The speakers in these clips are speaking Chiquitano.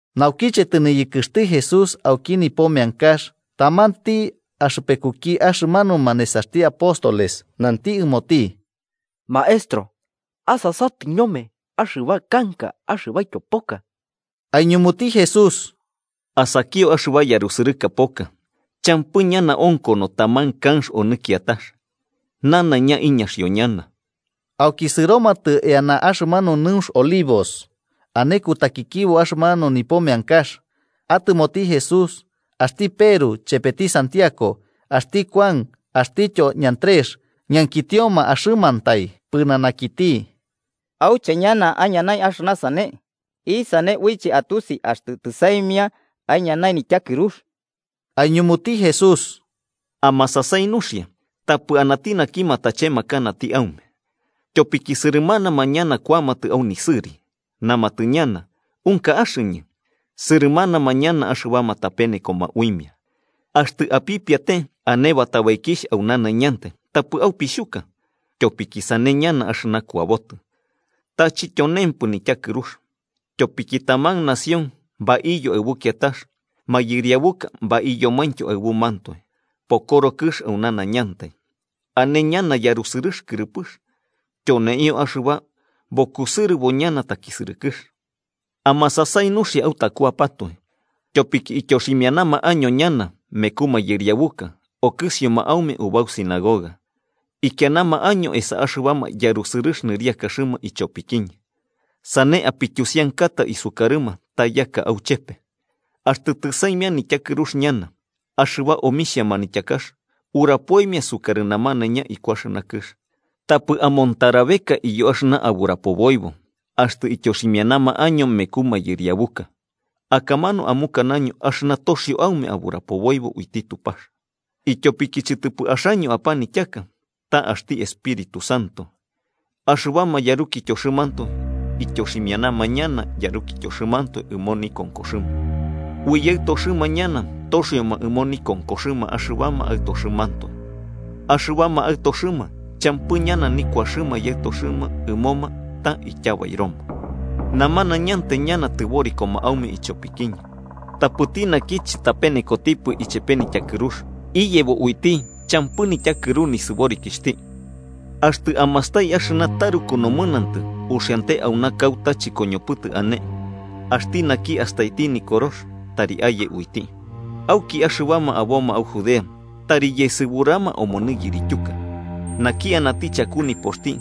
Naukiche tɨniyɨkɨxti Jesús auki nipo meankax, tamanti axɨpekuki axɨmanuma nesaxti apóstoles nanti ɨmoti: –¡Maestro, asasatɨ ñome axɨba kanka axɨbaityo poka! Aiñumuti Jesús: –¿Asakio axɨba yarusɨrɨka poka? Champɨ ñana onkono taman kanx onɨ kiatax. Nanaiña iñaxio ñana. Auki sɨromatɨ eana axɨmanu nɨunx Olivos, ane kutakikibo axɨmanu nipo meankax. Atɨmoti Jesús, axti Peru, chepeti Santiago, axti Kuan axtityo Andrés ñankitioma axɨmantai pɨnanakiti auche ñana aiñanai axɨna sane, isane uiche atusi axtɨ tɨsaimia aiñanai nityakɨrux. Aiñumuti Jesús: “Amasasai nuxia, tapɨ anati naki matachemakanati aume. Tyopiki sɨrɨmanama ñana kuamatɨ au nisɨri. Namatɨ ñana: ‘Unka axɨñɨ’, sɨrɨmanama ñana axɨbama tapenekoma uimia. “Axtɨ apipiate ane batabaikixh au nanaiñantai, tapɨ aupixhuka. Tyopiki sane ñana axɨna kuabotɨ. Ta chityonempɨ nityakɨrux. Tyopiki taman nación baiyo aɨbu kiatax mayɨriabuka baiyomaintyo aɨbumantoe. Pokoro kɨx au nanaiñantai, ane ñana yarusɨrɨx kɨrɨpɨx. Tyoneio axɨba bukusɨrɨbo ñana takisɨrɨkɨx. “Amasasai nuxia autakuapatoe. Tyopiki ityoximianama año ñana meku mayɨriabuka okɨsioma aume ubau sinagoga. Ikianama año esa axɨbama yarusɨrɨx nɨriakaxɨma ichopikiñɨ. Sane apityusiankata isukarɨma ta yaka auchepe. Axtɨ tɨsaimia nityakɨrux ñana, axɨba omixhia manityakax urapoimia sukarɨ namanaiña iku axɨna kɨx. Tapɨ amontarabeka iyo axɨna aburapoboibo, axtɨ ityoximianama año meku mayɨriabuka. Akamanu amukanaño axɨna toxio aume aburapoboibo uiti Tupax, ityopiki chɨtɨpɨ axaño apanityaka, ta axti Espíritu Santo. Axɨbama yarukityoxɨmantoe ityoximianama ñana yarukityoxɨmantoe ɨmo nikonkoxɨma, ui yaɨtoxɨma ñana toxioma ɨmo nikonkoxɨma axɨbama aɨtoxɨmantoe. Axɨbama aɨtoxɨma champɨ ñana nikuaxɨma yaɨtoxɨma ɨmoma ta ityabairoma. Namanañantai ñana tɨborikoma aume ichopikiñɨ. Tapɨti naki chɨtapenekotipɨ ichepe nityakɨrux, iyebo uiti champɨ nityakɨru nisɨborikixhti. “Axtɨ amastai axɨna taruku nomɨnantɨ uxiante auna kauta chɨkoñopɨtɨ ane–axti naki astaiti Nikorox, tari aye uiti–, auki axɨbama aboma au Judea, tari yesɨburama omonɨ yirityuka. Naki anati chaku nipoxti,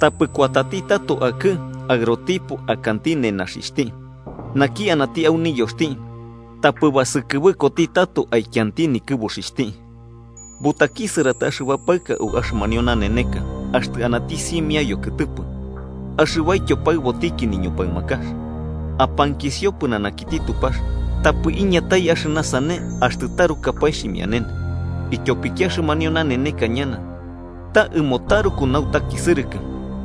tapɨ kuati tato akɨ'ɨ aɨrotipo akanti nenaxixhti. Naki anati au niyoxti, tapɨ basukɨbɨkoti tato aikianti nikɨbuxixhti. ¡Butakisɨratai axɨba paɨka au axɨmanio naneneka axtɨ anati simia yokɨtɨpɨ axɨbaityo paɨbotiki niñupaɨmakax! Apankisio pɨnanakiti Tupax tapɨ iñatai axɨna sane axtɨ tarukapae xhimianene, ityopiki axɨmanio naneneka ñana ta ɨmo taruku nautakisɨrɨkɨ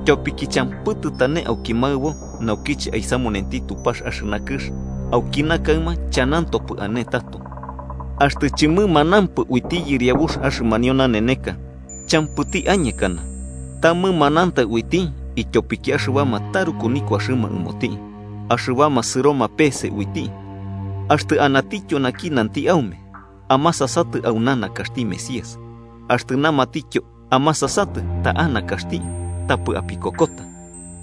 tyopiki champɨ tɨtane auki maɨbo naukiche aisamutenti Tupax axɨna kɨx, aukina kaɨma chanantopɨ ane tato. Axtɨ chɨmɨmanampɨ uiti Yɨriabux axɨmanio naneneka, champɨti añekana. Ta mɨmanantai uiti ityopiki axɨbama taruku nikuaxɨma ɨmoti, axɨbama sɨroma pe'ese uiti. “Axtɨ anatityo naki nanti aume: ‘Amasasatɨ, auna nakaxti Mesías’, axtɨ namatityo ‘Amasasatɨ, ta'a nakaxti’, tapɨ apikokota.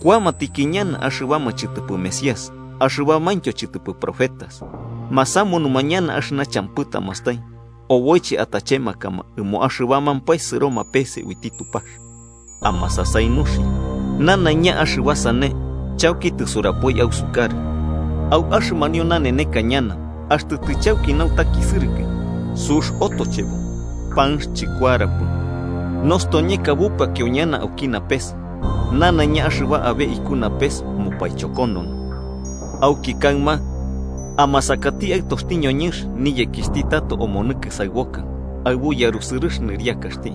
Kuamatiki ñana axɨbama chɨtɨpɨ mesías axɨbamaintyo chɨtɨpɨ profetas. Masamunuma ñana axɨna champɨ tamastai, oboiche atachemakama ɨmo axɨbamampae sɨroma pese uiti Tupax. ¡Amasasai nuxia! Nanaiña axɨba sane chauki tɨsurapoi ausukarɨ. “Au axɨmanio naneneka ñana, axtɨ tɨchauki nautakisɨrɨkɨ, sux otochebo, panx chɨkuarapɨ, nostoñeka bupakio ñana auki napes nanaiña axɨba abe iku napes mupaichokonono. Auki kaɨma amasakati Aɨtoxti ñoñɨnx niyekixhti tato omonɨ kɨsaɨboka aɨbu yarusɨrɨx nɨriakaxti.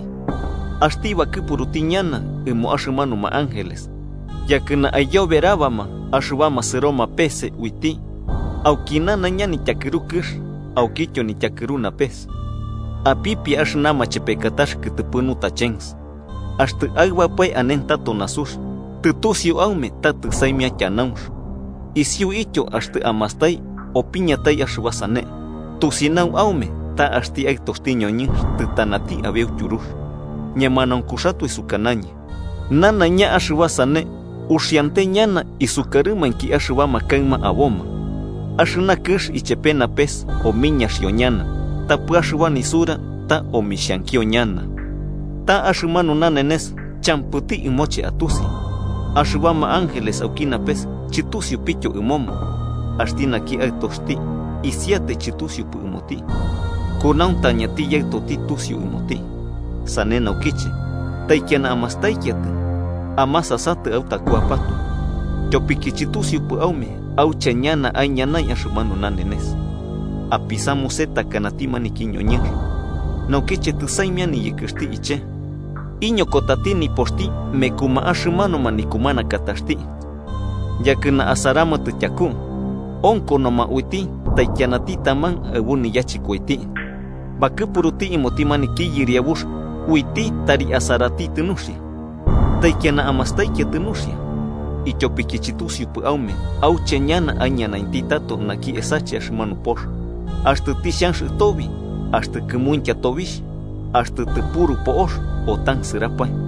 Axti bakɨpuruti ñana ɨmo axɨmanuma ángeles, yakɨna aiyoberabama axɨbama sɨroma peese uiti auki nanaiña nityakɨru kɨx, aukityo nityakɨru napes. “Apipia axɨna machepekatax kɨtɨpɨ nutachens: Axtɨ aɨbapae anentato nasux, tɨtusiu aume ta tɨsaimia tyanaunx. Isiuityo, axtɨ amastai opiñatai axɨba sane, tusinau aume ta axti Aɨtoxti ñoñɨnx tɨtanati abeu tyurux. Ñemanaunkuxatoe sukanañɨ ñanaiña axɨba sane uxiante ñana isukarɨmainki axɨbama kaɨma aboma. Axɨna kɨx ichepe napes omiñaxio ñana, tapɨ axɨba nisura ta omixhankio ñana. “Ta axɨmanu nanenes, champɨti ɨmoche atusi, axɨbama ángeles auki napes chɨtusiupityo ɨmoma, axti naki Aɨtoxti isiatai chɨtusiupɨ ɨmoti. Kunautañati Yaɨtoti tusiu ɨmoti. “Sane naukiche, taikiana amastaikiatɨ amasasatɨ autakuapatoe, tyopiki chɨtusiupɨ aume auche ñana aiñanai axɨmanu nanenes. Apisamuse takanati maniki ñoñɨnx, naukiche tɨsaimia niyɨkɨxti iche, iñokotati nipoxti mekuma axɨmanuma nikumanakataxti yakɨna asaramatɨ tyaku. Onkonoma uiti taikianati taman aɨbu niyachɨkoiti, bakɨpuruti ɨmoti maniki yɨriabux uiti tari asaratitɨ nuxia. Taikiana amastaikiatɨ nuxia, ityopiki chɨtusiupɨ aume auche ñana aiñanainti tato naki esache axɨmanu pox, axtɨ tixhanx ɨtobi, axtɨ kɨmuintya tobixh, axtɨ tɨpuru po'ox o tansɨrapae.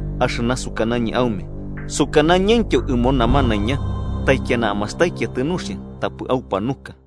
Axɨna sukanañɨ aume, sukanañɨntyo ɨmo namanaiña: ¡Taikiana amastaikiatɨ nuxia tapɨ aupanuka!”